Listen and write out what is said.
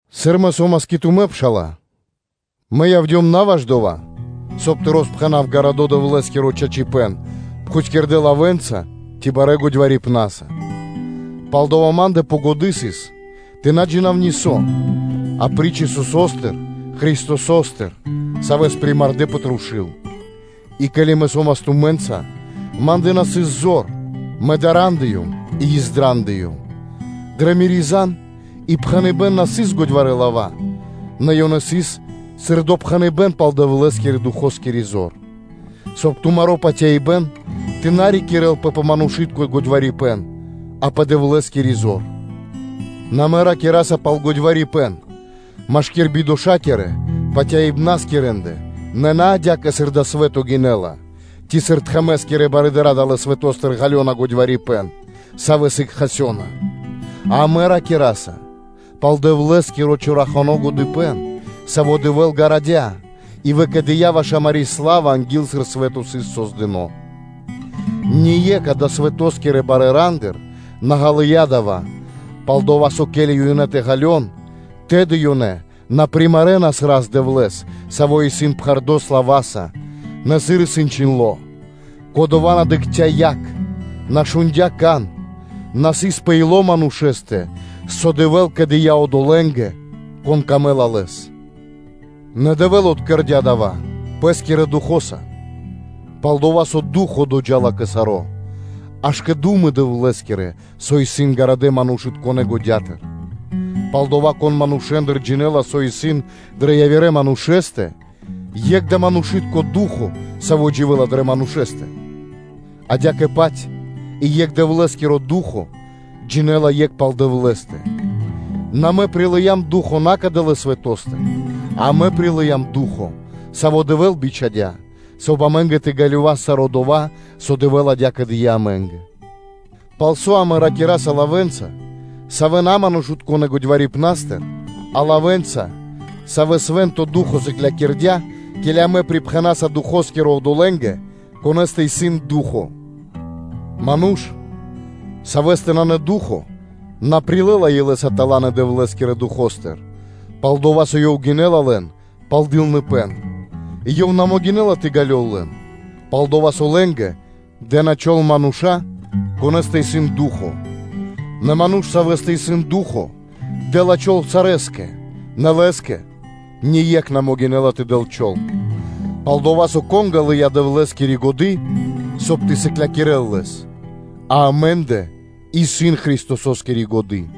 Сыр мэ со́мас кэ тумэ́, пшала́лэ, мэ явдём на ваш дова́, соб (кай) тэ роспхэнав Дэвлэ́скиро чорахано чачипэ́н пхутькирдэ́ лавэ́нца ци барэ́ годьварипнаса. Палдава́ ма́ндэ пэ годы́ сыс тэ на джина́в нисо́, апри́ч Исусо́стэ Христосо́стэ, Савэс примардэ пэ трушу́л. И ке́ли мэ со́мас тумэ́нца, ма́ндэ на сыс зор, мэ дарандыем и издрандыём; дрэ мири́ зан и пхэныбэ́н на сыс годьварэ́ лава́, нэ ёнэ сыс сыр допхэныбэ́н пал Дэвлэ́скирэ-Духоскири зор; соб (кай) тумаро́ патяибэ́н тэ на рикирэлпэ пэ манушы́тко годьварипэн, а пэ Дэвлэ́скири зор. Нэ амэ ракираса пал годьварипэн машки́р бидошакирэ патяибнаскирэндэ, нэ на адя́кэ, сыр дава́ свэ́то гинэ́ла, ци, сыр тхэмэ́скирэ барыдыра́ далэ́ свэто́стыр ґалёна годьварипэн, савэ́ сыг кончынэнапэ. А амэ ракираса пал Дэвлэ́скиро чорахано годыпэ́н, саво́ Дэвэ́л гарадя и выкэдыя́ ваш амари́ сла́ва анги́л, сыр свэ́то сыс создыно́ (кэрдо́): ние́кх адалэ́ свэто́скирэ барэ́ рандыр на ґалыя́ дава́, пал-дова́ со, ко́ли ёнэ тэ ґалён, тэды ёнэ на примарэнас Рас-Дэвлэ́с, Саво́ исын пхэрдо́ слава́са, нэ сыр исын чхиндло́: “Кодова́ на дыкхця́ якх, на шундя́ кан, на сыс пэ ило́ манушэ́стэ, со Дэвэ́л кэдыя одолэ́нгэ, конэ́скэ яця́ дро́го Ёв; нэ Дэвэ́л откэрдя дава́ Пэ́скирэ Духо́са, пал-дова́ со Ду́хо (Фа́но) доджа́ла кэ саро́, аж кэ ду́мы Дэвлэ́скирэ, со исын ґарадэ́ манушытконэ́ годятыр.” Палдава́, кон манушэ́ндыр джинэ́ла, со исын дрэ явирэ манушэ́стэ, екх дава́ манушы́тко Ду́хо (Фа́но), саво́ дживэ́ла дрэ манушэ́стэ? Адя́кэ-паць и екх Дэвлэ́скиро Ду́хо (Фа́но) джинэ́ла екх пал Дэвлэ́стэ. Нэ амэ прилыям ду́хо (фа́но) на кадалэ́ свэто́стыр, а амэ прилыям Ду́хо (Фа́но), Саво́ Дэвэ́л бичхадя́, соб (кай) амэ́нгэ тэ ґалёвас саро́ дова́, со Дэвэ́л адя́кэ дыя́ амэ́нгэ: пал со амэ ракираса лавэ́нца, савэ́ на манушытконэ́-годьварипнастыр, а лавэ́нца, савэ́ свэ́нто Ду́хо (Фа́но) сыклякирдя́, ке́ли амэ пирипхэнаса Духоскиро одолэ́нгэ, конэ́стэ исын Ду́хо (Фа́но). Ману́ш, савэ́стэ нанэ Ду́хо (Фа́но), на прилэ́ла илэ́са таланы Дэвлэ́скирэ Духо́стыр, пал-дова́ со ёв гинэ́ла лэн пал дылныпэ́н; и ёв на могинэ́ла тэ ґалёл лэн, пал-дова́ со лэ́нгэ дэ́на чол (тими́н) мануша́, конэ́стэ исын Ду́хо (Фа́но); нэ ману́ш, савэ́стэ исын Ду́хо (Фа́но), дэ́ла чол сарэскэ, нэ лэ́скэ ние́кх на могинэ́ла тэ дэл чол. Пал-дова́ со, кон ґалыя́ Дэвлэ́скири годы́, соб (кай) тэ сыклякирэ́л Лэс? А амэ́ндэ исын Христососкири годы́.